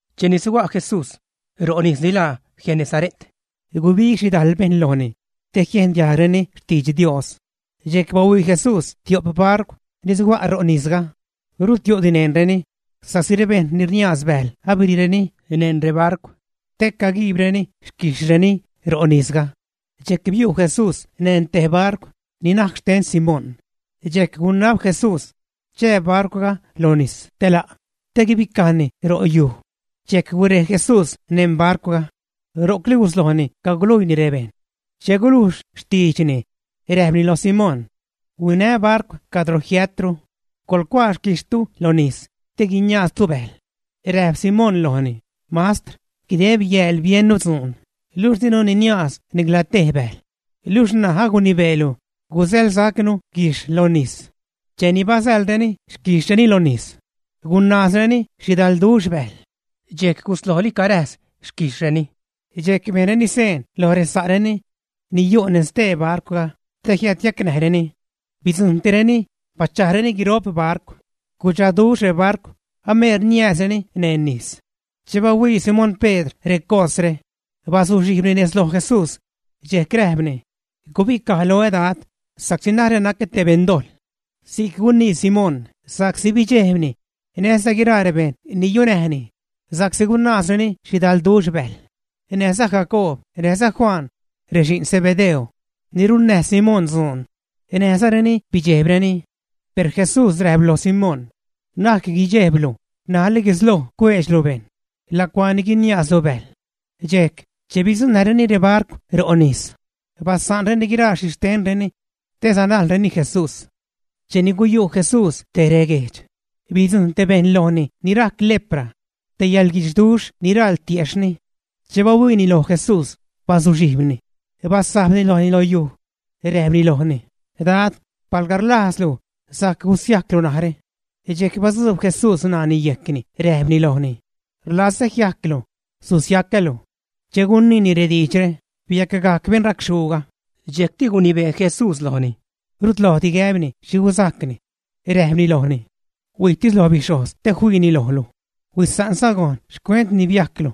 Cheni suga' Jesús ro' nis ni laa Genesare't, gubig xhidajl bejṉ lojni te jiejn diajgreni xtidx Dios. Dxejc bahuii Jesús tio'p barcw ni suga' ro' nisga, rud yu'di neṉreni sa'csi rebejṉ ni rniaaz bäjl abiriireni neṉ rebarcw te caguiibreni xquijxhreni ro' nisga. Dxejc biu' Jesús neṉ te barcw ni najc xten Simón, dxejc gunab Jesús chää barcwga lo nis te la', te guibicajni ro' yuj. Dxejc gurej Jesús neṉ barcwga, ro'cli guslojni caguluiini rebejṉ. Che gulujx xtiidxni, räjpni loj Simón: ―Huinä barcw cadro jiätru, coḻcuaa xquijxhtu lo nis te guiniaaztu bäjl. Räjp Simón lojni: ―Mastr, guideb yääl biennu dzuun, luxh dinu niniaaz nicla tej bäjl, niluxh ṉaj agunibeelu gusäḻsacnu guijxh lo nis. Cheni basäḻreni xquijxhreni lo nis, gunaazreni xhidalduxh bäjl, dxejc guslojli caräjs xquijxhreni. Dxejc bejnreni seen loj resa'reni ni yu' neṉ stee barcwga te jiädyacnäjreni. Bidzujṉtireni, bachajreni guiro'p barcw. Gudxaduxh rebarcw, ameer niääzreni neṉ nis. Che bahuii Simón Pedr recosre, bazuxhijbni nez loj Jesús, dxejc räjpni: ―Gubicaj loä Dad, sa'csi narä nacä te beṉdojḻ. Si'c gunii Simón sa'csi bidxejb laani näjza guiraa rebejṉ ni yunäjni sa'csi gunaazreni xhidalduxh bäjl. Näjza Jacoob näjza Juan, rexi'n Zebedeo, ni runnäj Simón dzuun, näjzareni bidxejbreni. Per Jesús räjp lo Simón: ―Na'c guidxejblu, ṉajli guisloj cueedxlu bejṉ lacuaa ni guiniaazlu bäjl. Dxejc, che bidzuṉnäjreni rebarcw ro' nis, basa'nreni guiraa xhixtenreni, te sanajlreni Jesús. Cheni guyu' Jesús tej reguejdx, bidzujṉ te bejṉ lojni ni rajc lepra te yäḻguidxduxh ni raḻ tiejxhni. Che bahuiini loj Jesús, bazuxhijbni, basajbni lojni lo yuj, räjpni lojni: ―Dad, palga rlajzlu, sajc gusiajclu narä. Dxejc batzuub Jesús ṉaani yejcni räjpni lojni: ―Rlazä jiajclu. Susiacälu. Che guniini rediidxre, biacgajc beṉ racxhuuga. Dxejcti gunibee Jesús lojni rut lojdi gäbni xhi guzajcni. Räjpni lojni: ―Huijtis lo bixhojz te fiini lojlu, huisa'nza gojn xcuent ni biajclu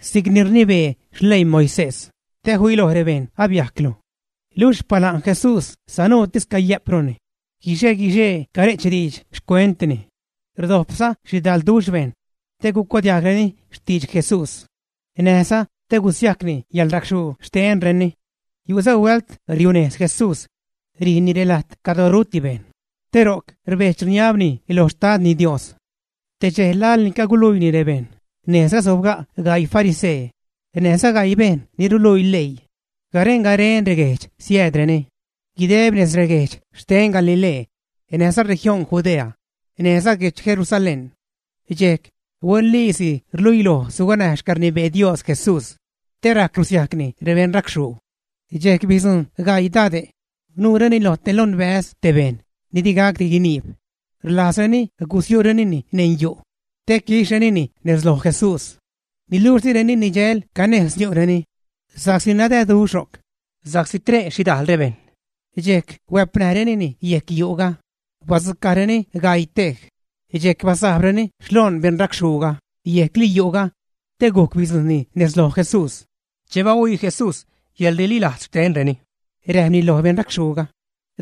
si'cni rnibee xleii Moisés, te filoj rebejṉ abiajclu. Luxh xpala'n Jesús sanuutis cayä'pruni, guixe-guixee care'ch diidx xcuentni. Rdojpza xhidalduxh bejṉ te gucuadiajgreni xtidx Jesús näjza te gusiajcni yäḻracxhuu xtenreni. Yu'za huält riunejz Jesús rijni relajt cadro ruti rebejṉ, te ro'c rbedx-rniabni lo Xtadni Dios. Te dxej laḻni caguluiini rebejṉ, nejzga sobga' gaii farisee näjza gaii bejṉ ni ruluii leii garen-garen reguejdx, siäädreni guideb nez reguejdx xten Galilee, näjza región Judea, näjza guedx Jerusalén. Dxejc huenliisi rluiloj suganäj xcäḻrnibee Dios Jesús te rajc russiajcni rebeṉracxhuu. Dxejc bidzujṉ gaii dade' nuureni lo te lonbäz te bejṉ ni di gacdi guiniib, rlajzreni gusiu'renini neṉ yu' te quixhrenini nez loj Jesús. Niluxh direni nidxäl canejz niu'reni sa'csi nadäduxh ro'c sa'csi tre' xhidajl rebejṉ. Dxejc huäpnäjrenini yejc yu'ga, badzucajreni gaii tej, dxejc basajbreni xloon beṉracxhuuga yejcli yu'ga te gujc bidzujṉni nez loj Jesús. Che bahuii Jesús yäḻrililajz xtenreni, räjpni loj beṉracxhuuga: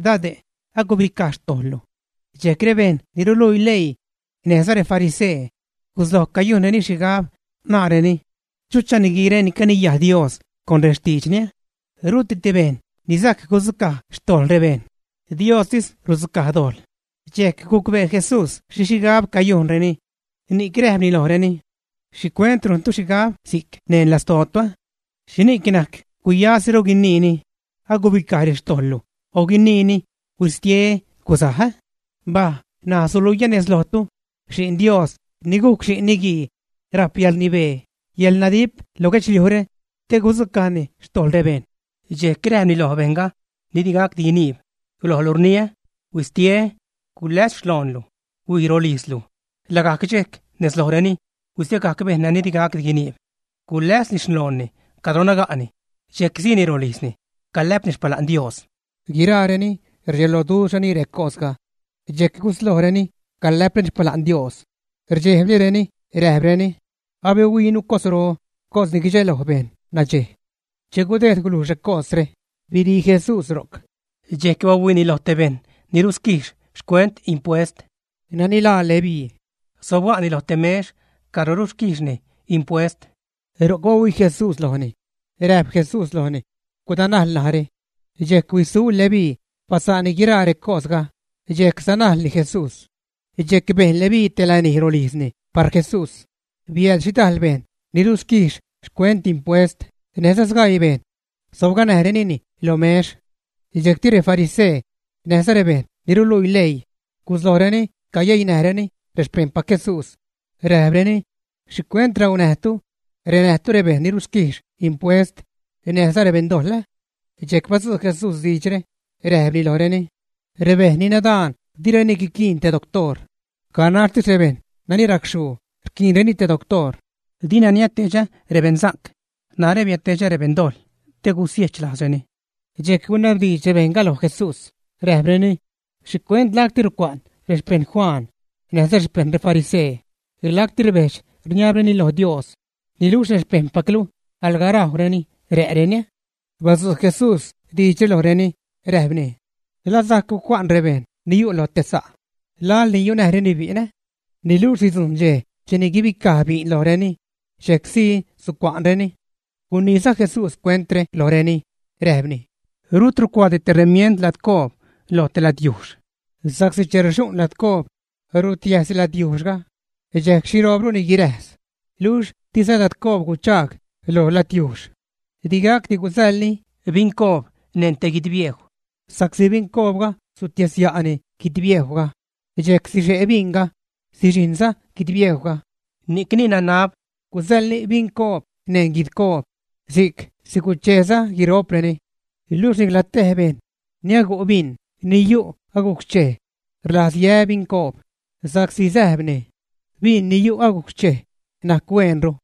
―Dade', agubicaj xtojḻlu. Dxejc rebejṉ ni ruluii leii näjza refarisee gusloj cayujnreni xhigab, naareni: “¿Chucha niguiire ni caniyajni Dios con rextiidxni? Ruti te bejṉ ni sajc gudzucaj xtojḻ rebejṉ, Diostis rudzucaj dojḻ.” Dxejc gucbee Jesús xhi xhigab cayujnreni, ni'c räjpni lojreni: ―¿Xhicuent rujntu xhigab si'c neṉ lastootu? ¿Xhini'c najc guyasiru guiniini: “Agubicaj rextojḻlu”, o guiniini: “Huistie, guzaj”, ä? Mbaj ṉaj, suluiä nez lojtu Xi'n Dios ni gujc Xi'n Niguii rajp yäḻrnibee, yäḻnadip lo guedxliujre te gudzucajni xtojḻ rebejṉ. Dxejc räjpni lo bejṉga ni digacdi guiniib: ―Lojlu rniä, ¡huistie, guläs xloonlu, huij rolijzlu! Lagajc dxejc nez lojreni huistiegajc bejṉ ni digacdi guiniib, guläsni xloonni cadro naga'ni, dxejc siini rolijzni, calä'pni xpala'n Dios. Guiraareni rdxeloduxhreni recosga, dxejc guslojreni calä'preni xpala'n Dios, rdxejblireni räjpreni: ―Abihuiinu cosro, cos ni guidxeloj bejṉ nadxej. Che gudejd gulujx recosre, birii Jesús ro'c. Dxejc bahuiini lo te bejṉ ni rusquijx xcuent impuest, nani laa Leví. Sobga'ni lo te mex cadro rusquijxni impuest; ro'c bahuii Jesús lojni. Räjp Jesús lojni: ―Gudanajl narä. Dxejc huisu Leví, basa'nni guiraa recosga, dxejc sanajlni Jesús. Dxejc bejn Leví te lanij rolijzni par Jesús. Biääd xhidajl bejṉ ni rusquijx xcuent impuest näjza sgaii bejṉ; sobganäjnireni lo mex. Dxejcti refarisee näjza rebejṉ ni ruluii leii guslojreni cayeinäjreni rexpejṉpac Jesús, räjpreni: ―¿Xhicuent raunäjtu, ränäjtu rebejṉ ni rusquijx impuest näjza rebeṉdojḻ, ä? Dxejc badzu' Jesús diidxre, räjpni lojreni: ―Rebejṉ ni nadaan di guiquiin te doctoor, ganaxtis rebejṉ nani racxhuu rquiinreni te doctoor. Dina niädtedxä rebeṉsa'c, narä biädtedxä rebeṉdojḻ te gusiechlajzreni. Dxejc gunabdiidx rebejṉga loj Jesús, räjpreni: ―¿Xhicuent lacti rucua'n rexpejṉ Juan näjza rexpeṉ refarisee, lacti rbedx-rniabreni loj Dios; niluxh rexpejṉpaclu alga rajwreni, rä'reni? Badzu' Jesús diidxre lojreni, räjpni: ―¿La sajc gucua'n rebejṉ ni yu' lo te sa' laḻni yunäjreni bi'n, ä? Niluxh sidzujṉ dxej cheni sibicaj bi'n lojreni, dxejc sii sucua'nreni. Guniiza Jesús cuentre lojreni, räjpni: ―Rut rucuaadi te remiend ladcoob loj te ladyujxh, sa'csi che rxu'n ladcoob rutiäjzni ladyujxhga, dxejc xhiroobruni guiräjs, luxh diza ladcoob guchaag lo ladyujxh. Di gacdi gusäḻni bincoob neṉ te guidbiejw sa'csi bincoobga sutiäsya'ni guidbiejwga dxejc sixe' binga, sixijṉza guidbiejwga. Ni'cni nanab gusäḻni bincoob neṉ guidcoob si'c sigucheeza guiro'preni. Luxh nicla tej bejṉ ni agu' bin ni yu' agujc xchej rlajz yä bincoob, sa'csi säjbni: “Bin ni yu' agujc xchej najc huenru.”